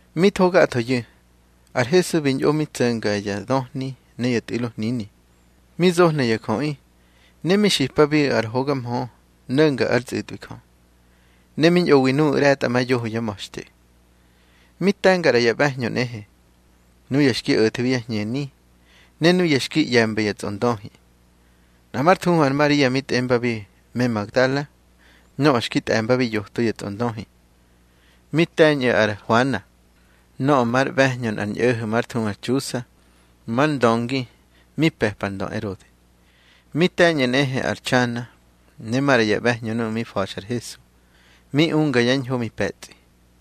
Mi tho gathoyu̱, ar Hesu bi ñꞌo mi tso̱nga ya döhni ne ya tꞌu̱lo hnini, mi zohna ya jöꞌi, ne mi xipabiꞌu̱ ar hoga mhö no̱nga ár tsꞌu̱tꞌwi Jö. Ne mi ñꞌowi nuꞌu̱ ꞌre̱tꞌamayoho yá ma̱xte. Mi te̱nga ꞌra ya ꞌbe̱hñö nꞌehe, nuya xki o̱thebi yá hñeni, ne nuya xki ꞌye̱mba ya tsꞌondöhi. Nꞌa már thuhu ar Maria mi tꞌembabi me Magdala, nöꞌö xki tꞌe̱mbabi yoto ya tsꞌondöhi. Mi te̱ñꞌu̱ ar Huana, nöꞌö már ꞌbe̱hñö nꞌar ñꞌo̱ho̱ már thuhu ar Txusa, mar ndöngi mi pe̱pa ar ndö Erode. Mi te̱ñꞌu̱ nꞌehe ar Txana, ne maꞌra ya ꞌbe̱hñö nuꞌu̱ mi fa̱xa ar Hesu, mi unga yá ñho mi pe̱tsꞌi.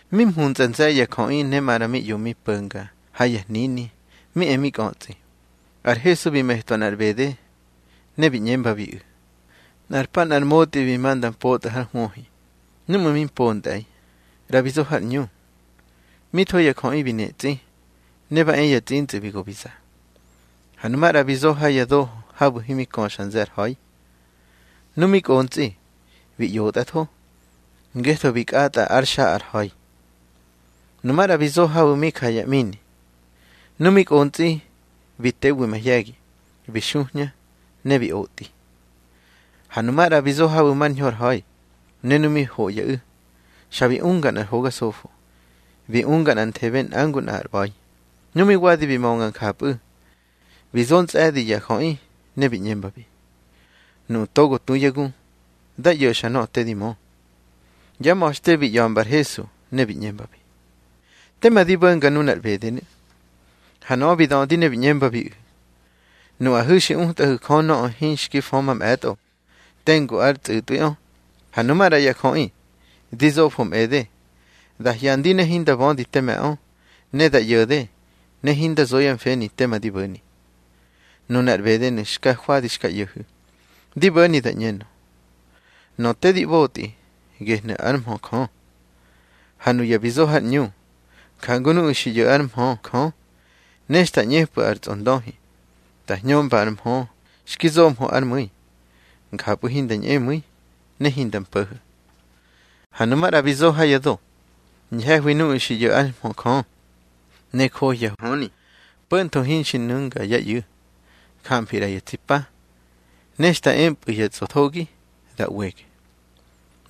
Mi mhuntsꞌa nze̱ye̱ ya jöꞌi, ne maꞌra mi ꞌyo mi po̱nga ha yá hnini mi e mi kꞌötsꞌi, ar Hesu bi metwa nꞌar ꞌbede, ne bi ꞌñembabiꞌu̱: —Nꞌar pa nꞌar motꞌi bi ma nda mpotꞌa hár hwöhi. Núꞌmu̱ mi mpontꞌe̱i, ꞌra bi zo har ꞌñu. Mi tho ya jöꞌi bi netsꞌi, ne ba e ya tsꞌintsꞌu̱ bi go bi za. Ha nu maꞌra bi zo ha ya do habu̱ himi köxa nze̱ ar ha̱i. Nu mi kꞌontsꞌi, bi ꞌyotꞌatho, ngetho bi kꞌatꞌa ár xa ar ha̱i. Nu maꞌra bi zo habu̱ mi ja ya ꞌmini. Nu mi kꞌontsꞌi bi tewi mahye̱gi, bi xuhña ne bi otꞌi. Ha nu maꞌra bi zo habu̱ mar ñho ar ha̱i, ne nu mi hoꞌyaꞌu̱, xa bi unga nꞌar hoga sofo, bi unga nꞌanthebe nꞌa ngu nꞌa ar ꞌba̱i. Nu mi wadi bi mönga njapꞌu̱, bi zo ntsꞌe̱di ya jöꞌi, ne bi ꞌñembabi: —Nuꞌu̱ togo tu yá gu, dá ꞌyo̱xa nöꞌö te di mö. Yá ma̱xte bi ꞌya̱mba ar Hesu ne bi ꞌñembabi: —Teme di bo̱nga nunar ꞌbedenu̱. Ha nöꞌö bi dödi ne bi ꞌñembabiꞌu̱: —Nuꞌahu̱ xi utꞌahu̱ Jö nöꞌö hinxki fö mamꞌe̱tꞌo tengu ár tsꞌu̱tꞌwiꞌö. Ha nu maꞌra ya jöꞌi, di zofo mꞌede. Da hyandi ne hinda bödi teme̱ꞌö, ne da ꞌyo̱de ne hinda zo yá mfeni tema di bo̱ni. Nunar ꞌbedenu̱ xka jwadi xka ꞌyo̱hu̱, di bo̱ni da ꞌñenö: Nöꞌö te ꞌbotꞌi, gehnu̱ ár mhö Jö. Ha nuya bi zo har ꞌñu, jangu nuꞌu̱ xi ꞌyo̱ ár mhö Jö. Ne xta ꞌñepꞌu̱ ar tsꞌondöhi da hñömba ar mhö xki zohmö ár mu̱i, njapꞌu̱ hinda ñꞌemu̱i ne hinda mpo̱ho̱. Ha nu maꞌra bi zo ha ya do, ñhe̱hwi nuꞌu̱ xi ꞌyo̱ ár mhö Jö, ne johya höni, po̱ntho hinxi nu̱nga yá ꞌyu̱. Jamfi ꞌra ya tsi pa, ne xta epꞌu̱ ya tsꞌothogi da ꞌwege.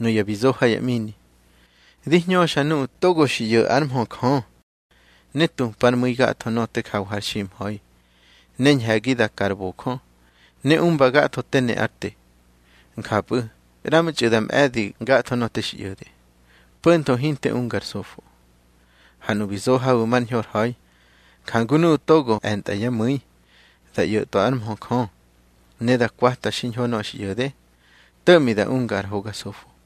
Nuya bi zo ha ya ꞌmini, di hñöxa nuꞌu̱ togo xi ꞌyo̱ ár mhö Jö, ne tupár mu̱i gatho nöꞌö te jawa har ximha̱i, ne ñhe̱gi da ka ar bojö, ne umba gatho te ne ár te. Njapꞌu̱ ꞌramtxꞌu̱ da ꞌbe̱di gatho nöꞌö te xi ꞌyo̱de, po̱ntho hinte unga ar sofo. Ha nuꞌu̱ bi zo habu̱ mar ñho ar ha̱i, njangu nuꞌu̱ togo e̱ntꞌa yá mu̱i da ꞌyo̱twa ár mhö Jö, ne da kwata xiñho nöꞌö xi ꞌyo̱de, to̱ꞌmi da unga ar hoga sofo.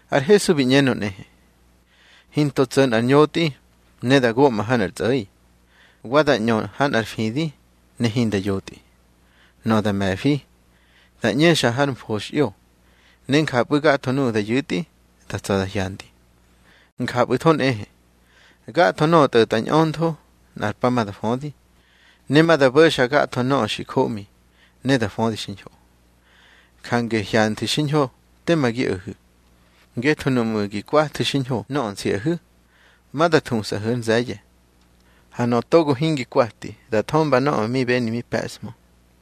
Ar Hesu bi ꞌñenö nꞌehe: —Hinto tso̱ nꞌar ñotꞌi ne da goꞌma ha nꞌar tsꞌo̱i, wa da ꞌñö ha nꞌar fidi ne hinda yotꞌi. Nöꞌö da me̱fi, da ꞌñexa har mfoxꞌyo, ne njapꞌu̱ gatho nuꞌu̱ da yu̱tꞌi da tsa̱ da hyandi. Njapꞌu̱tho nꞌehe gatho nöꞌö tꞌo̱tꞌa ñꞌöntho, nꞌar pa ma da födi, ne ma da bo̱xa gatho nöꞌö xi joꞌmi, ne da födi xiñho. Jange hyanthu̱ xiñho tema gi o̱hu̱, ngetho nuꞌmu̱ gi kwathu̱ xiñho nöꞌö nsiꞌahu̱, ma da thusꞌahu̱ ár nze̱ye̱. Ha nöꞌö togo hingi kwati, da thömba nöꞌö mi beni mi pe̱ꞌshmö.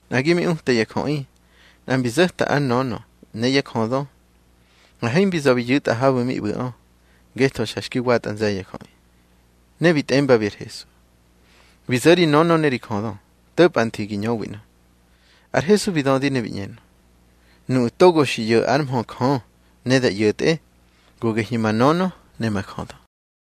Nꞌagi mi uta ya jöꞌi, nꞌa mbi zo̱ta ár nönö ne yá jödö, ha himbi za̱ bi yu̱tꞌa habu̱ mi ꞌbu̱ꞌö, ngetho xa xki watꞌa nze̱ye̱ ya jöꞌi. Ne bi tꞌembabi ar Hesu: —Bi zo̱ ri nönö ne ri jödö, to̱pꞌa nthi gi ñöwi ꞌnö. Ar Hesu bi dödi ne bi ꞌñenö: —Nuꞌu̱ togo xi ꞌyo̱ ár mhö Jö ne da ꞌyo̱tꞌe, go gehyu̱ ma nönö ne ma jödö.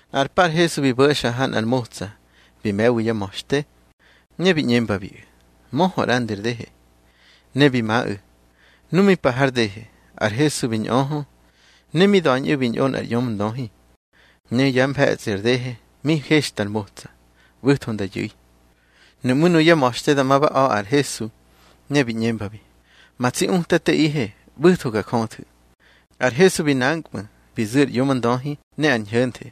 Nꞌar pa ar Hesu bi bo̱xa ha nꞌar motsa bi me̱wi yá ma̱xte, ne bi ꞌñembabiꞌu̱: —Möhö ꞌrandi ar dehe. Ne bi maꞌu̱. Nu mi pa har dehe, ar Hesu bi ñꞌöhö. Ne mi da̱ñꞌu̱ bi ñꞌo nꞌar ꞌyomndöhi, ne yá mfe̱tsꞌi ar dehe mi hexta ar motsa, ꞌbu̱tho nda yu̱i. Nuꞌmú̱ nuyá ma̱xte dama ba a̱ ar Hesu, ne bi ꞌñembabi: —Ma tsi Utateꞌihe, ꞌbu̱tho ga jöthu̱. Ar Hesu bi nankꞌmu̱ bi zu̱ ar ꞌyomndöhi ne ar ñho̱nthe.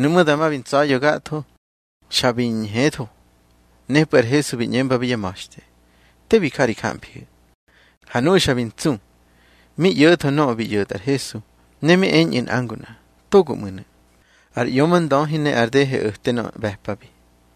Nuꞌmú̱ dama bi ntsa̱ya̱ gatho, xa bi ñhetho. Nepꞌu̱ ar Hesu bi ꞌñembabi yá ma̱xte: —Te bi ja ri jamfihu̱. Ha nuꞌu̱ xa bi ntsu, mi ꞌyo̱tho nöꞌö bi ꞌyo̱tꞌa ar Hesu, ne mi eñꞌu̱ nꞌa ngu nꞌa: —Togonu̱ ꞌmu̱. Ar ꞌyomndöhi ne ar dehe o̱te nöꞌö ꞌbe̱pabi.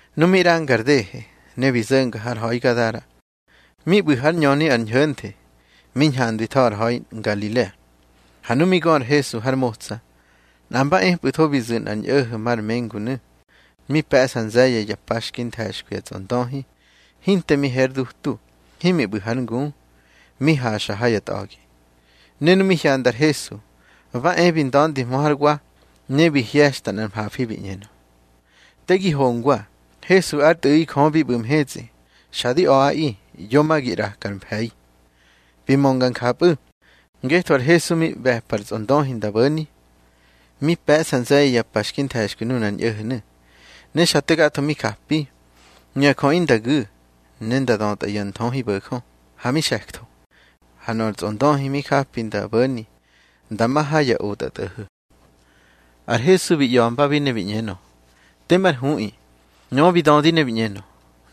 Nu mi ꞌranga ar dehe, ne bi zo̱nga har ha̱i Gadara, mi ꞌbu̱ hár ñöni ar ñho̱nthe, mi ñhandwitho ar ha̱i Ngalilea. Ha nu mi gö ar Hesu har motsa, nꞌa mba epꞌu̱tho bi zu̱ nꞌar ñꞌo̱ho̱ mar mengunu̱. Mi pe̱ꞌsa nze̱ye̱ ya pa xki nthe̱xkwi ya tsꞌondöhi, hinte mi he ar dutu, himi ꞌbu̱ hár ngu, mi haxa ha ya tꞌa̱gi. Ne nu mi hyanda ar Hesu, ba e bi nda̱ndihmö hár wa, ne bi hye̱xa nꞌar mhafi bi ꞌñenö: —Te gi hongwa, Hesu ár Tꞌu̱ꞌi Jö bi ꞌbu̱ mhetsꞌi. Xa di a̱ꞌaꞌi, yo ma gi ꞌraka ar mfe̱i. Bi mönga njapꞌu̱ ngetho ar Hesu mi ꞌbe̱pa ar tsꞌondöhi nda bo̱ni. Mi pe̱ꞌsa nze̱ye̱ ya pa xki nthe̱xkwi nunar ñꞌo̱ho̱nu̱, ne xa te gatho mi japi. Nuya jöꞌi nda gu̱ ne nda dötꞌa ya nthöhibo̱jö, ha mi xe̱ktho. Ha nöꞌö ar tsꞌondöhi mi japi nda bo̱ni nda ma ha ya otꞌatꞌo̱ho̱. Ar Hesu bi ꞌya̱mbabi ne bi ꞌñenö: —Temár huꞌi. Nöꞌö bi dödi ne bi ꞌñenö: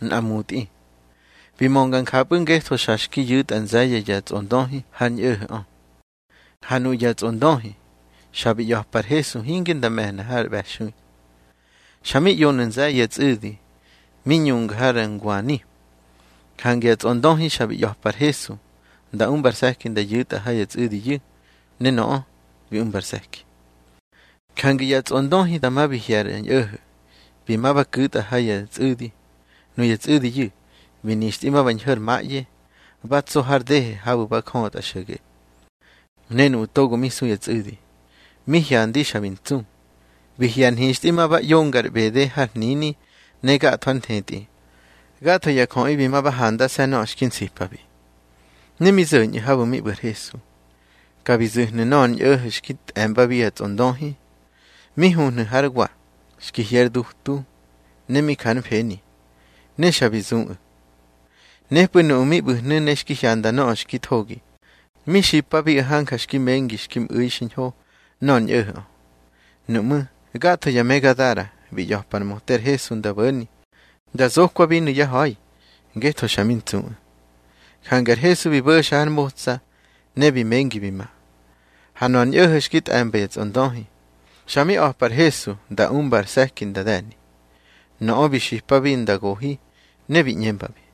—Nꞌa mutꞌi. Bi mönga njapꞌu̱, ngetho xa xki yu̱tꞌa nze̱ye̱ ya tsꞌondöhi har ñꞌo̱ho̱ꞌö. Ha nuꞌu̱ ya tsꞌondöhi xa bi ꞌya̱pa ar Hesu hinge nda me̱hna har ꞌbe̱xui. Xa mi ꞌyonu̱ nze̱ye̱ ya tsꞌu̱di, mi ñunga har ngwani. Jange ya tsꞌondöhi xa bi ꞌya̱pa ar Hesu nda umba ar se̱ki nda yu̱tꞌa ha ya tsꞌu̱diyu̱. Ne nöꞌö bi umba ar se̱ki. Jange ya tsꞌondöhi dama bi hye̱ ar ñꞌo̱ho̱, bi ma ba ku̱tꞌa ha ya tsꞌu̱di. Nuya tsꞌu̱diyu̱ bi nixtꞌi ma ba ñho̱ har maꞌye, ba tso har dehe habu̱ ba jötꞌa xo̱ge. Ne nuꞌu̱ togo mi su ya tsꞌu̱di, mi hyandi xa bi ntsu, bi hye̱ ar nhixtꞌi ma ba ꞌyonga ar ꞌbede har hnini ne gatho ár nthetꞌi. Gatho ya jöꞌi bi ma ba handase̱ nöꞌö xki nsipabi. Ne mi zo̱ñꞌu̱ habu̱ mi ꞌbu̱ ar Hesu, ka bi zu̱hnu̱ nöꞌö ar ñꞌo̱ho̱ xki tꞌe̱mbabi ya tsꞌondöhi, mi huhnu̱ hár wa, xki hye ár dutu, ne mi ja ár mfeni. Ne xa bi zuꞌu̱. Nepꞌu̱ nuꞌu̱ mi ꞌbu̱hnu̱ ne xki hyanda nöꞌö xki thogi, mi xipabiꞌu̱ hanja xki mengi xki mꞌu̱i xiñho nöꞌö ar ñꞌo̱ho̱ꞌö. Nuꞌmú̱ gatho ya me Gadara bi ꞌya̱pa ar möte ar Hesu nda bo̱ni nda zokwabinu̱ yá ha̱i, ngetho xa mi ntsuꞌu̱. Jange ar Hesu bi bo̱xa har motsa, ne bi mengi bi ma. Ha nöꞌö ar ñꞌo̱ho̱ xki tꞌe̱mba ya tsꞌondöhi, xa mi a̱pa ar Hesu nda umba ar se̱ki nda de̱ni. Nöꞌö bi xipabi nda gohi, ne bi ꞌñembabi: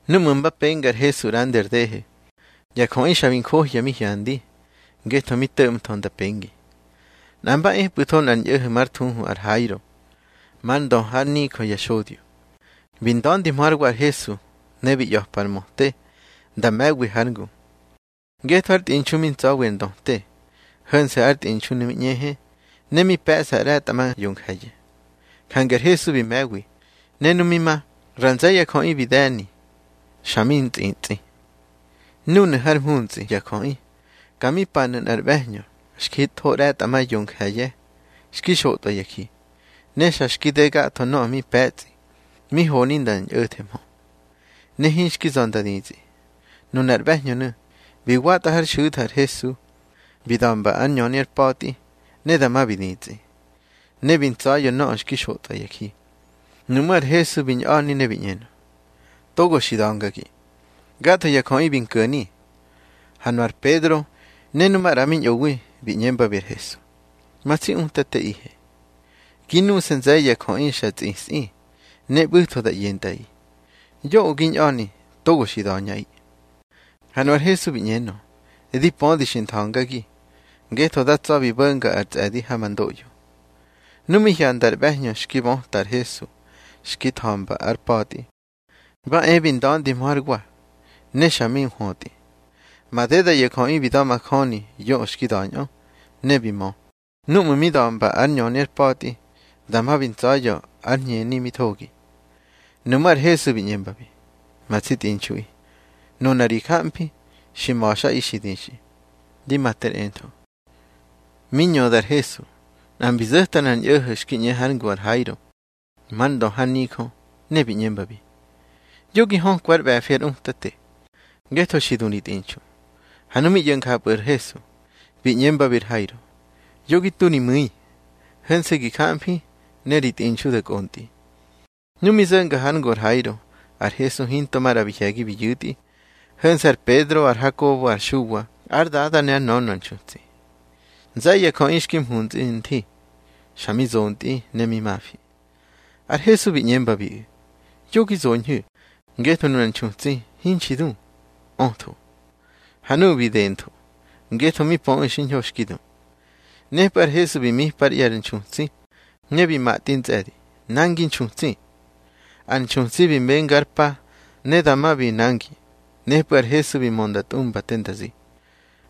Núꞌmu̱ mba penga ar Hesu ꞌrandi ar dehe, ya jöꞌi xa bi njohya mi hyandi, ngetho mi to̱ꞌmtho nda pengi. Nꞌa mba epꞌu̱tho nꞌar ñꞌo̱ho̱ már thuhu ar Hairo, mar ndö hár nijö ya xodyonu̱. Bi nda̱ndihmö hár wa ar Hesu, ne bi ꞌya̱pa ar möte nda me̱wi hár ngu. Ngetho ár tꞌinxu mi ntsa̱wi ar ndöte. Ho̱nse̱ ár tꞌinxunu̱ mi ꞌñehe, ne mi pe̱ꞌsa ꞌre̱tꞌa ma yonje̱ye̱. Jange ar Hesu bi me̱wi. Ne nu mi ma, ra nze̱ ya jöꞌi bi de̱ni, xa mi tsꞌitsꞌi. Núnu̱ hár mhuntsꞌi ya jöꞌi, ka mi panu̱ nꞌar ꞌbe̱hñö xki tho ꞌre̱tꞌa ma yonje̱ye̱ xki xotꞌwa ya ji. Ne xa xki de gatho nöꞌö mi pe̱tsꞌi mi honi nda ñꞌo̱thehmö, ne hinxki za̱ nda ditsꞌi. Nunar ꞌbe̱hñönu̱ bi watꞌa hár xu̱tha ar Hesu, bi da̱mba ár ñöni ár pa̱tꞌi. Ne dama bi ditsꞌi, ne bi ntsa̱ya̱ nöꞌö mi xotꞌwa ya ji. Nuꞌmú̱ ar Hesu bi ñꞌa̱ni ne bi ꞌñenö: —Togo xi da̱ngagi. Gatho ya jöꞌi bi nko̱ni. Ha nu ar Pedro ne nu maꞌra mi ñꞌowi, bi ꞌñembabi ar Hesu: —Ma tsi Utateꞌihe, gi nuse̱ nze̱ye̱ ya jöꞌi xa tsꞌisꞌi, ne ꞌbu̱tho da ꞌyentꞌaꞌi. Yoꞌö gi ñꞌa̱ni togo xi da̱ñꞌaꞌi. Ha nu ar Hesu bi ꞌñenö: —Di pödi xi ntha̱ngagi, ngetho da tsa̱ bi bo̱nga ar tsꞌe̱di ha ma ndoꞌyo. Nu mi hyanda ar ꞌbe̱hñö xki böta ar Hesu xki tha̱mba ár pa̱tꞌi, ba e bi nda̱ndihmö hár wa, ne xa mi nhwötꞌi. Madeda ya jöꞌi bi da̱majöni yoꞌö xki da̱ñꞌö, ne bi mö, núꞌmu̱ mi da̱mba ár ñöni ár pa̱tꞌi, dama bi ntsa̱ya̱ ar hñeni mi thogi. Nuꞌmú̱ ar Hesu bi ꞌñembabi: —Ma tsi tꞌinxuꞌi, nuna ri jamfi xi ma̱xꞌi xi dixꞌi. Di ma ter entho. Mi ñöda ar Hesu, nꞌa mbi zo̱ta nꞌar ñꞌo̱ho̱ xki ꞌñe hár ngu ar Hairo már ndö har nijö, ne bi ꞌñembabi: —Yo gi hökwa ár ꞌbe̱fi ar Utate, ngetho xi du ri tꞌinxu. Ha nu mi ꞌyo̱ njapꞌu̱ ar Hesu, bi ꞌñembabi ar Hairo: —Yo gi tu ri mu̱i, ho̱nse̱ gi jamfi ne ri tꞌinxu da kꞌontꞌi. Nu mi zo̱nga hár ngu ar Hairo, ar Hesu hinto maꞌra bi hye̱gi bi yu̱tꞌi, ho̱nse̱ ar Pedro, ar Hakobo, ar Xuwa, ár dada ne ár nönö ar nxutsi. Nze̱ye̱ ya jöꞌi xki mhuntsꞌa nthi, xa mi zontꞌi ne mi mafi. Ar Hesu bi ꞌñembabiꞌu̱: —Yo gi zoñhu̱, ngetho nunar nxutsi hinxi du, ötho. Ha nuꞌu̱ bi dentho, ngetho mi pöꞌu̱ xiñho xki du. Nepꞌu̱ ar Hesu bi mipa ár ꞌye̱ ar nxutsi, ne bi matꞌi ntsꞌe̱di: —Nangi nxutsi. Ar nxutsi bi menga ár pa, ne dama bi nangi. Nepꞌu̱ ar Hesu bi mö nda tꞌumba te nda zi.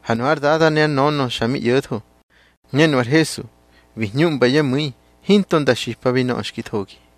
Ha nu ár dada ne ár nönö xa mi ꞌyo̱tho. Ne nu ar Hesu bi hñuꞌmba yá mu̱i hinto nda xipabi nöꞌö xki thogi.